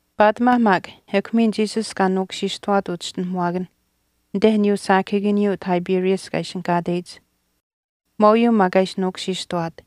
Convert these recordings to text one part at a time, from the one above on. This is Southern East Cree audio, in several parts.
Paatimaa maak ekw miin Jesus kaa nuukushiishtawaat uchischinuhamuwaakanh anite aniyuu saakahiikaniyuu Tiberias kaa ishinihkaateyich. Maaute maak kaa ishi nuukushiishtawaat.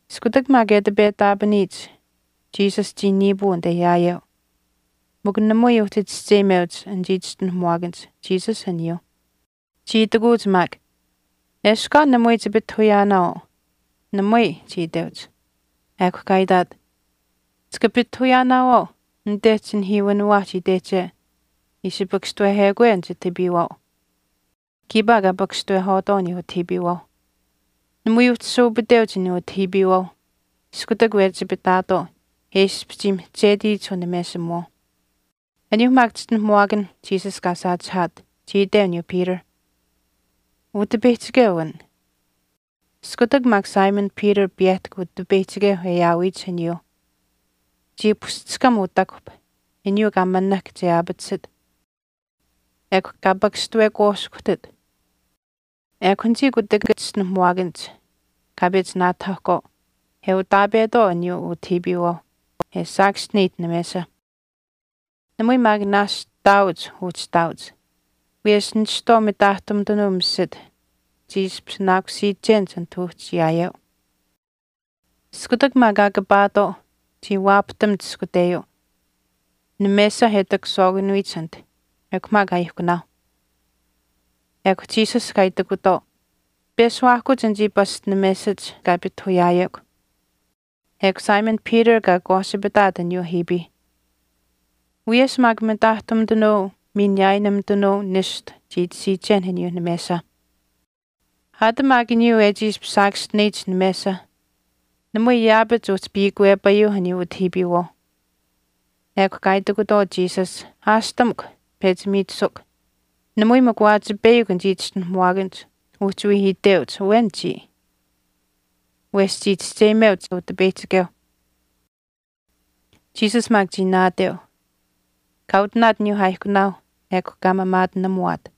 Iskutak maak e ati petaapaniyich, Jesus chii niipuu anite yaayeu, mikw namui uhchi chischeyimeuch anichii chischinuhamuwaakanich Jesus aniyuuh. Chii itikuuch maak, “Eshkw aa namui chipitahuyaanaawaau.” “Namui,” chii iteuch. Ekw kaa itaat, “Chika pitahuyaanaawaau anite chinihiiwiniwaahch itehche ishi pakashtawehekwe an chitahiipiiwaau.” Kiipaa kaa pakashtawehwaatwaau aniyuu utahiipiiwaauh. Namui uhchi saupiteuch aniyuuh utahiipiiwaau iskutak wehchipitaatwaau e ishpish chii mihchetiyich unamesimuwaauh. Aniyuuh maak chischinuhamuwaakan Jesus kaa saachihaat, chii iteu aniyuu Peter, “Utipeyihchikeu an.” Iskutak maak Simon Peter piyehtahk Utipeyihchikeu e aawiyich aniyuuh chii pushchishkam utakuhp aniyuu kaa manahk che aapatisit, ekw kaa pakashtawekwaashkuhtit. Ekw anichii kutakach chischinuhamuwaakanich kaa pechi naatakahahkwaau, e utaapetwaau aniyuu utahiipiiwaauh e saakaschineyich namesa. Namui maak naashch taauch uhchi ihtaauch, wiyesh nishtwaau mitaahtumitanuu misit chii ishpishinaakusiichenich anit uhchi yaayeu. Iskutak maak kaa kapaatwaau chii waapahtamuch ishkuteyuu namesa e takashwaakanuyich anit ekw maak aaihkunaauh. Ekw Jesus kaa itikutwaau, “Peshuwaahkuch anichii pasch namesach kaa pitahuyaayekw.” Ekw Simon Peter kaa akwaasipitaat aniyuu ahiipiih. Wiyesh maak mitaahtumitanuu miin niyaayinumitanuu nishtu chii tashiichen aniyuuh namesa. Aat maak aniyuu e chii ishpish saakaschineyich namesa namui yaapach uhchi piikwepayuuh aniyuu utahiipiiwaauh. Ekw kaa itikutwaau Jesus, “Aashtamukw, pechi miichisukw.” Namui maak waachipeyakw anichii chischinuhamuwaakanich uhchi wii iteuch, “Awen chiya.” Wesh chii chischeyimeuch Utipeyihchikeu aniyuuh. Jesus maak chii naateu, kaa utinaat aniyuu aaihkunaauh ekw kaa maamaatinamuwaat,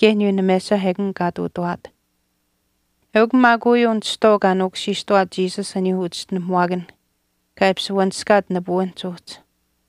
kaye aniyuu namesa ekun kaa ihtuutawaat. Eukw maak uyuu nishtwaau kaa nuukushiishtawaat Jesus aniyuuh uchischinuhamuwaakanh kaa ishpish wanishkaat nipuwinhch uhchi.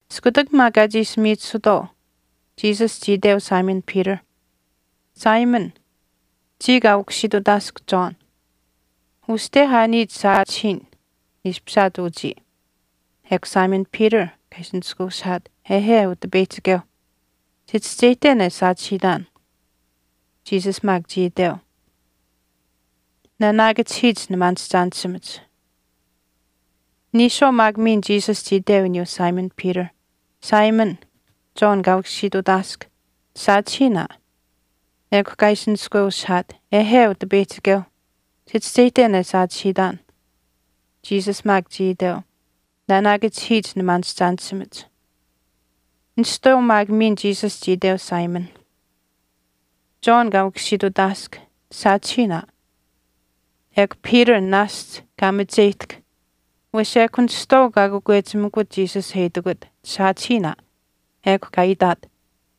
Iskutak maak kaa chiishi miichisutwaau, Jesus chii iteu Simon Peter, “Simon, chii kaa ukusiitutaask John, uste aa niya chisaachihiin ishpishaat uchii.” Ekw Simon Peter kaa ishi nishkweushihaat, “Ehe, Utipeyihchikeu, chichischeyihten e saachihiitaan.” Jesus maak chii iteu, “Nanaakachihiich nimaanishchaanishimach.” Niishwaau maak miin Jesus chii iteu aniyuu Simon Peter, “Simon, John kaa ukusiitutaask, chisaachihiin aa.” Ekw kaa ishi nishkweushihaat, “Ehe, Utipeyihchikeu, chichischeyihten e saachihiitan.” Jesus maak chii iteu, “Nanaakachihiich nimaanishchaanishimach.” Nishtwaau maak miin Jesus chii iteu, “Simon, John kaa ukusiitutaask, chisaachihiin aa.” Ekw Peter naashch kaa macheyihtahk wesh ekw nishtwaau kaa kakwechimikut Jesus e itikut, “Chisaachihiin aa.” Ekw kaa itaat,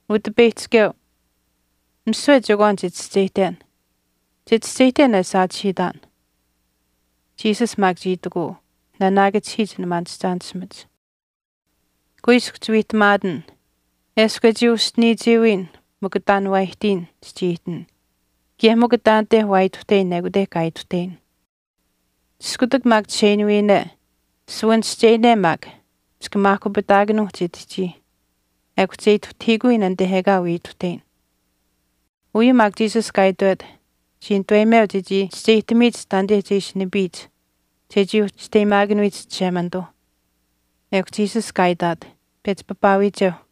“Utipeyihchikeu, misiwe chekwaan chichischeyihten, chichischeyihten e saachihiitaan.” Jesus maak chii itikuu, “Nanaakachihiich nimaanishchaanishimach. Kuiskw chiwiihtamaatin, eshkw e chii uschiniichiiwiin mikw taan waa aihtiin chichii ihtin kaye mikw taanite waa ituhteyin ekute kaa ituhteyin. Iskutak maak chisheinuuyine, suwanischeyine maak chika maahkupitaakanuu chitihchii ekw che ituhtahiikuyin anite ekaa wii ituhteyin.” Uyuu maak Jesus kaa itwet chii nituweyimeu chechii chischeyihtamiyich taanite che ishi nipiyich chechii uhchi chisteyimaakanuyich Chishemanituu. Ekw Jesus kaa itaat, “Pechi papaawiicheuh.”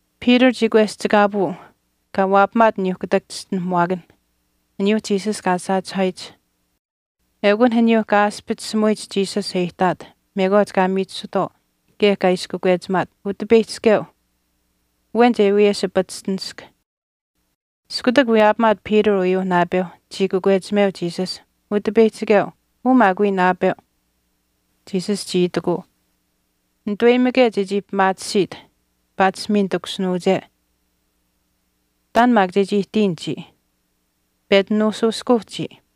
Peter chii kweschikaapuu kaa waapamaat aniyuu kutak chischinuhamuwaakan, aniyuu Jesus kaa saachihaayich. Eukun aniyuu kaa aaspichisimuyich Jesus e ihtaat mekwaach kaa miichisutwaau kaye kaa ishi kakwechimaat, “Utipeyihchikeu, awen che wiyeshipachishtinisk.” Iskutak wiyaapamaat Peter uyuu naapeu chii kakwechimeu Jesus, “Utipeyihchikeu, uu maak wii naapeu.” Jesus chii itikuu, “Nituweyimike chechii pimaatisiit paatish miin takushinuuche, taan maak chechii ihtiyin chiya. Pechi nuushuushkuu chiya.”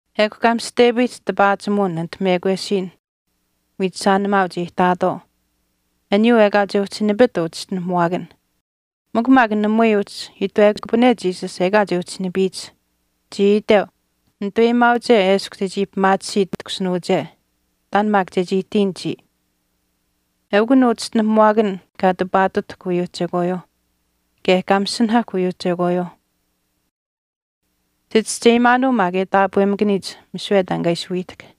Ekw kaa mishihtepayihch tipaachimuwin anit mekwesiin wiichishaanimaauch e ihtaatwaau aniyuu ekaa che uhchi nipit uu chischinuhamuwaakan. Mikw maak namui uhchi itwekupane Jesus ekaa che uhchi nipiyich. Chii iteu, “Netuweyimaauche eshkw chechii pimaatisiit takushinuuche, taan maak chechii ihtiyin chiya.” Eukun uu chischinuhamuwaakan kaa tipaatutahk uyuuh chekwaayuuh, kaye kaa masinahahk uyuuh chekwaayuuh. Chichischeyimaanuu maak e taapwemakaniyich misiwe taan kaa ishi wiihtahk.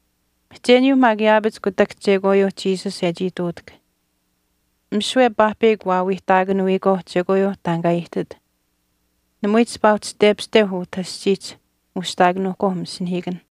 Mihcheniyuu maak yaapach kutak chekwaayuu Jesus e chii ihtuutahk. Misiwe paahpeyakw waawiihtaakanuyikwaau chekwaayuuh taan kaa ihtit, namui chipaa uhchii tepashteuh utah aschiihch ushihtaakanuuhkwaau masinahiikanh.